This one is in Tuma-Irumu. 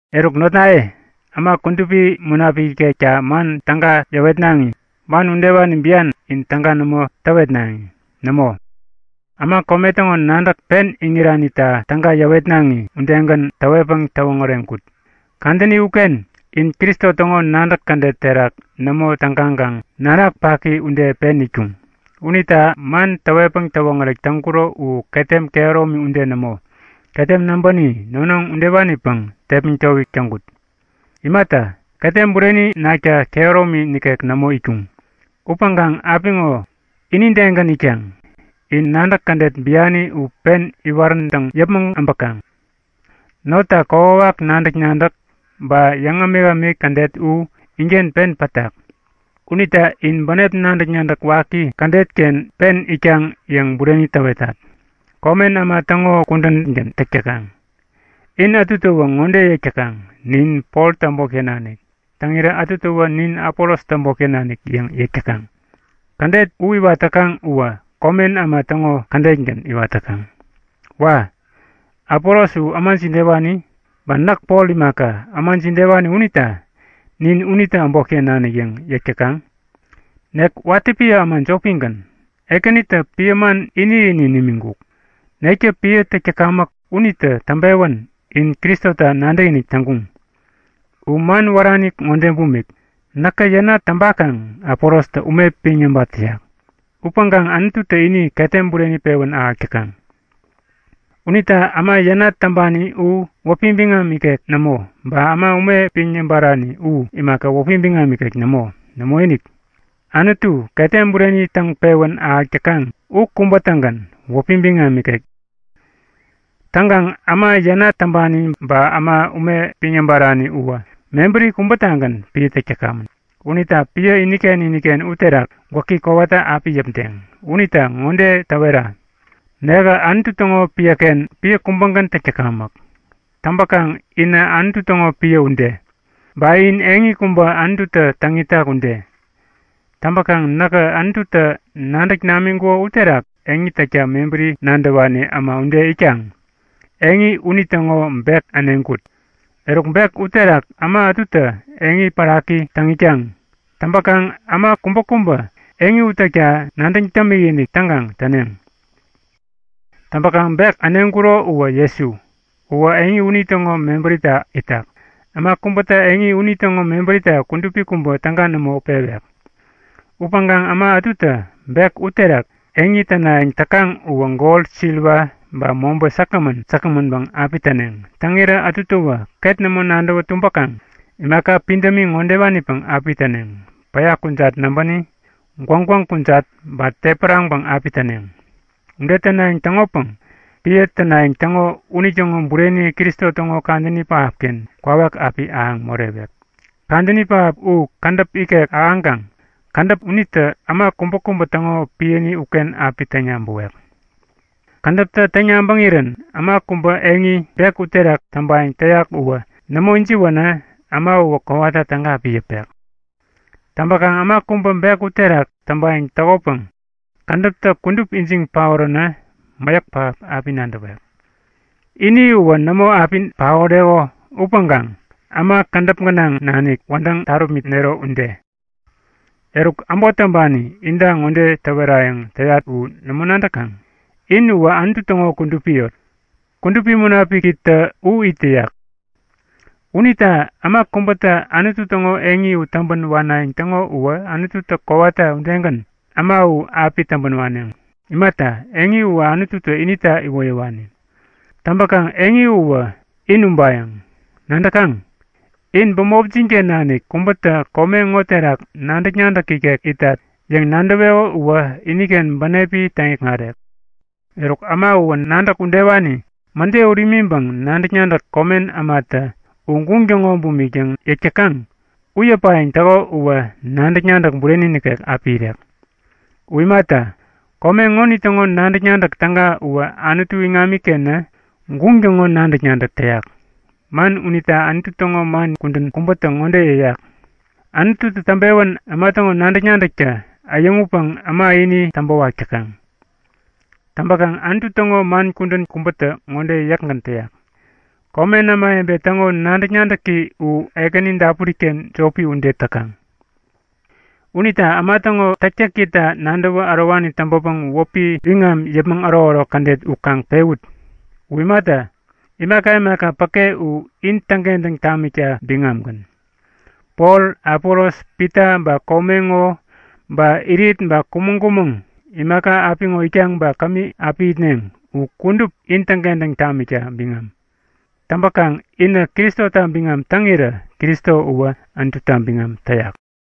Eruk notnaye, äma Kudupi Munapik ikekta man täga yäwetnaŋi, man udewani bian in täga nämo täwetnaŋi. Nämo, äma kome täŋo nadäk pen iŋiranita täga yäwetnaŋi udegän täwetpäŋ täwoŋäreŋkut. Kadäni uken in Kristo täŋo nadäk kädet terak nämo tägaŋkaŋ nanak paki ude pen itkuŋ. Unita man täwetpäŋ täwoŋärek täŋkuro u ketem kehäromi ude nämo, ketem näbäni, nonoŋ udewanipäŋ tepmäŋ towik täŋkut. Imata, ketem bureni nakta kehäromi nikek nämo itkuŋ. Upäŋkaŋ apiŋo inidegän itkaŋ! In nadäk kädet biani u pen iwaräntäŋ yäpmäŋ äbäkaŋ. Notta kokwawak nadäk-nadäk ba yäŋ-ämikämik kädet u inken pen pätak. Unita in bänep nadäk-nadäk waki kädet-ken pen itkaŋ yäŋ bureni täwetat. Komen äma täŋo kudängän täk täkaŋ. In ätutäwä ŋode yäk täkaŋ; Nin Poltä äbotken nanik. Täŋirä ätutäwä Nin Apolostä äbotken nanik yäŋ yäk täkaŋ. Kädet u iwat täkaŋ uwä komen äma täŋo kädetgän iwat täkaŋ. Wa! Apolos u äma jidewani? Ba näk Pol imaka, äma jidewani unita nin unitä äbotken nanik yäŋ yäk täkaŋ? Nek watä piä äma jopigän, Ekänitä piä man ini-ini nimiŋkuk. Nektä piä täk täkamäk unitä täŋpewän in Kristota nadäkinik täŋkuŋ. U man wärani ŋode bumik; Näkä yänat täŋpakaŋ Apolostä ume piŋ yäbat täyak. Upäŋkaŋ Anututä ini ketem bureni pewän ahäk täkaŋ. Unita äma yänat täŋpani u wäpi biŋam ikek nämo. Ba äma ume piŋ yäbarani u imaka, wäpi biŋam ikek nämo. Nämoinik, Anutu, ketem bureni täŋ pewän ahäk täkaŋ u kubä-tägän wäpi biŋam ikek. Täŋkaŋ äma yänat täŋpani u ba äma ume piŋ yäbarani uwä mebäri kubätagän piä täk täkamän. Unita piä iniken iniken uterak gwäki kowata api yäpdeŋ. Unita ŋode täwetat; Nekä Anutu täŋo piäken piä kubägän täk täkamäk. Täŋpäkaŋ inä Anutu täŋo piä ude. Ba in eŋi kubä Anututä täŋ itak ude. Täŋpäkaŋ näkä Anututä nadäk namiŋkuko uterak eŋi täkta mebäri nadäwani äma ude itkaŋ eŋi unitäŋo bek äneŋkut. Eruk bek uterak äma ätutä eŋi päraki täŋ itkaŋ. Täŋpäkaŋ äma kubäkubä eŋi u täkta nadäŋ dämikinik täŋkaŋ täneŋ. Täŋpäkaŋ bek äneŋkuro uwä Jesu. Uwä eŋi unitäŋo mebärita itak. Äma kubätä eŋi unitäŋo mebärita kudupi kubä täga nämo pewek. Upäŋkaŋ äma ätutä bek uterak eŋi tänayäŋ täkaŋ uwä gol siliwa ba mobä säkgämän säkgämänpäŋ api täneŋ. Täŋirä ätutäwä ket nämo nadäwä tumbäkaŋ imaka pidämi ŋodewanipäŋ api täneŋ; Päya kujat näbäni, gwäŋgwäŋ kujat ba tepäraŋpäŋ api täneŋ. Ude tänayäŋ täŋopäŋ piä tänayäŋ täŋo unitäŋo bureni Kristo täŋo Kadäni Pähapken kwawak api ahäŋ morewek. Kadäni pähap u kädäp ikek ahäŋkaŋ kädäp unitä äma kubäkubä täŋo piäni uken api täŋ-yabäwek. Kädäptä täŋ-yabäŋirän äma kubä eŋi, bek uterak täŋpayäŋ täyak uwä nämo ijiwänä äma uwä kowata täga api yäpek. Täŋpäkaŋ äma kubä bek uterak täŋpayäŋ täkopäŋ kädäptä kudup ijiŋ paoränä mäyäk pähap api nadäwek. Ini uwä nämo api paoreko upäŋkaŋ äma kädäp gänaŋ nanik wädäŋ tarupmitnero ude. Eruk, äbot täŋpani inta ŋode täwerayäŋ täyat u nämo nadäkaŋ? In uwä Anutu täŋo kudupi yot, Kudupi Munapikitä u it täyak. Unita äma kubätä Anutu täŋo eŋi u täŋpän wanayäŋ täŋo uwä Anututä kowata udegän äma u api täŋpän waneŋ. Imata, eŋi uwä Anututä inita iwoyäwani. Täŋpäkaŋ eŋi uwä in ubayäŋ. Nadäkaŋ? In bämopjin-ken nanik kubätä kome ŋo terak nadäk-nadäk ikek itat yäŋ nadäweko uwä iniken bänepi täŋikŋarek. Eruk äma uwä nadäk udewani mäde ut imiŋpäŋ nadäk-nadäk komen ämatä U guŋ täŋo bumik yäŋ yäk täkaŋ u yäpayäŋ täko uwä nadäk-nadäk bureni nikek api irek. U imata, kome ŋonitäŋo nadäk-nadäk täga uwä Anutu iŋamikenä guŋ täŋo nadäk-nadäk täyak. Man unita Anutu täŋo man kudän kubätä ŋode yäyak; Anututä täŋpewän äma täŋo nadäk-nadäktä äyäŋutpäŋ äma ini täŋpäwak täkaŋ. Täŋpäkaŋ Anutu täŋo man kudän kubätä ŋode yäkgän täyak; Komen ämawebe täŋo nadäk-nadäki u Ekäni dapuri-ken jopi ude täkaŋ. Unita äma täŋo täktäkita nadäwä ärowani täŋpäpäŋ wäpi biŋam yäpmäŋ ärokärok kädet u kaŋ pewut. U imata, imaka imaka päke u in täŋkentäŋ tamikta biŋamgän. Pol, Apolos, Pita, ba kome ŋo, ba irit ba kumäŋ-kumäŋ, imaka apiŋo itkaŋ ba kämi api itneŋ u kudup in täŋkentäŋ tamikta biŋam. Täŋpäkaŋ inä Kristota biŋam täŋirä Kristo uwä Anututa biŋam täyak.